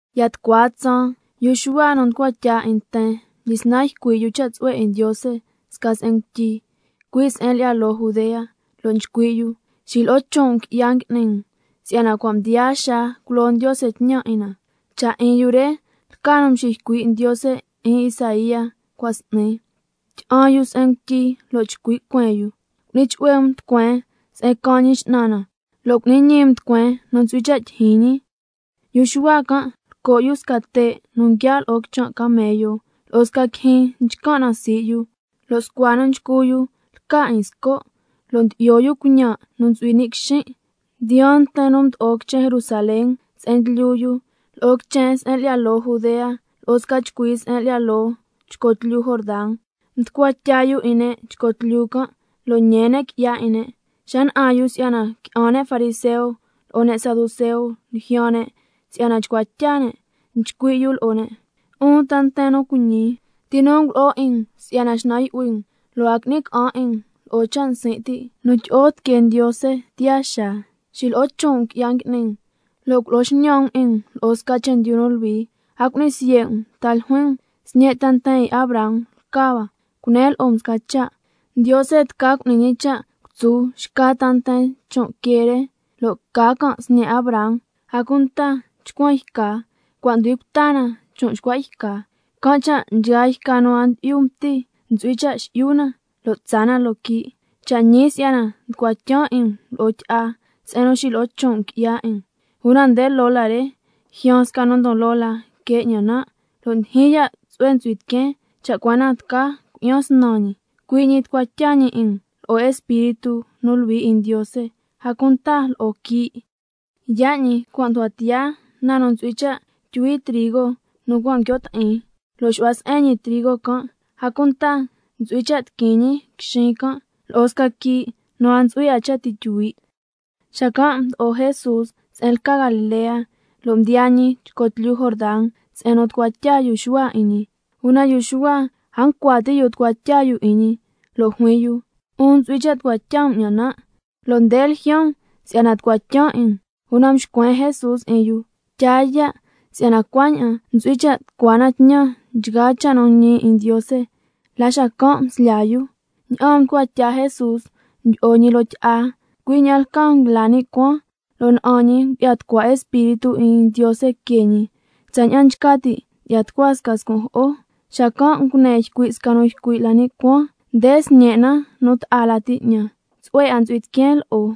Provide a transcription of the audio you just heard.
Ya tucua tsaan, yu Xuhua nu mducua tya 'in nten, mdyisnan ycui' yu cha' tsu'hue 'in Ndiose sca se'en ngutyi, cui' se'en lyi'ya loo Judea, lo' nchcui' yu: Xilo'o chon' um qui'ya ngui'ni um, si'yana cua' mdiyaa xaa culo Ndiose tñan 'in na. Nde cha' nu mxiycui' Ndiose 'in Isaía cua' s'ni: —Tyi'an yu se'en ngutyi lo' chcui' cueen yu: Cu'ni chu'hue um tucueen se'en caan Ñi X'nan na, lo' cu'ni ñi um tucueen nu ntsu'hui cha' tyijyin ñi—. Yu Xuhua can' lco' yu sca te' nu nguiaa' lo'o quichan' camello, lo'o sca quijyin nchcan' na sii' yu, lo' scua nu nchcu yu lca 'in sco', lo' ndyi'yo yu cuiñan' nu ntsu'hui ni' quixin'. Mdiyaan nten nu mdo'o quichen Jerusalén se'en ndlyu yu, lo'o quichen se'en lyi'ya loo Judea, lo'o sca chcui se'en lyi'ya loo chco tlyu Jordan, mducua tya yu 'in ne' chco tlyu can', lo' ñee ne' qui'ya 'in ne'. Xa na'an yu si'yana qui'an ne' fariseo lo'o ne' saduceo ljyaan ne' si'yana chcua tya ne', nchcui' yu lo'o ne': 'Un ta nten nu cuiñi, ¿ti nu ngulo'o 'in um si'yana xnan yu'hui um, lo' a qui'ni ca'an 'in um lo'o cha' nsin' ti' nu tyi'o tiquee Ndiose tiyaa xaa? Xilo'o chon' um qui'ya ngui'ni um, lo' culo'o xñan um 'in um lo'o sca chendyu nu luhui. A cu'ni siye' um ta ljuin um: Sñe' ta nten 'in Abraham lca hua. Cunen lo'o um sca cha': Ndiose tca cu'ni ñi cha' cutsu xca ta nten chon' quee re, lo' ca can' sñe' Abraham. A cunta chcuan yca cua' nducui cuta na chon' xcua' yca, can' cha' nchgaa yca nu a ndyi'yu mti ntsu'hui cha' xi'yu na, lo' tsaa na loo quii'. Cha' ñii si'yana nducua tyan 'in um lo'o tyi'a, si'yana cua' mxilo'o chon' um qui'ya 'in um, una nde loo la re ljyaan sca nu ndon loo la que ña'an nan', lo' ndyijyin ya' tsu'hue ntsu'hui tiqueen cha' cua na tca cui'yan snan ñi, cui' ñi tucua tya ñi 'in um lo'o Espíritu nu Luhui 'in Ndiose, a cunta lo'o quii'. Yaa' ñi cua' nducua tiyaa na nu ntsu'hui cha' tyuhui trigo nu cua' nguio' ti'in, lo' xu'hua se'en ñi trigo can', a cunta ntsu'hui cha' tiquin ñi quixin can', lo'o sca quii' nu a ntsu'hui 'a cha' ti' tyuhui'. Xacan' mdo'o Jesús se'en lca Galilea, lo' mdiyaa ñi chco tlyu Jordan se'en nu tucua tya yu Xuhua 'in ñi. Una yu Xuhua a ncua ti' yu tucua tya yu 'in ñi, lo' juin yu: 'Un ntsu'hui cha' tucua tya um 'ñan nan', lo' nde ljyaan um si'yana nan' tucua tyan 'in um. Una mxcuen Jesús 'in yu: Tyaa ya', si'yana cuaña'an ntsu'hui cha' tucua na tñan nchgaa cha' nu ñi 'in Ndiose. La xacan' mslyaa yu. Ña'aan mducua tya Jesús mdyi'o ñi loo tyi'a, cui' ña'an lcaa nguila ni' cuaan, lo' na'an ñi ngu'ya tucua Espíritu 'in Ndiose que ñi, tsaña'an nchca ti' ndyi'ya tucua sca scun' jo'o. Xacan' ngune ycui' sca nu ycui' la ni' cuaan: Nde Sñen' nu ta'a lati 'ñan, tsu'hue 'a ntsu'hui tiqueen lo'o.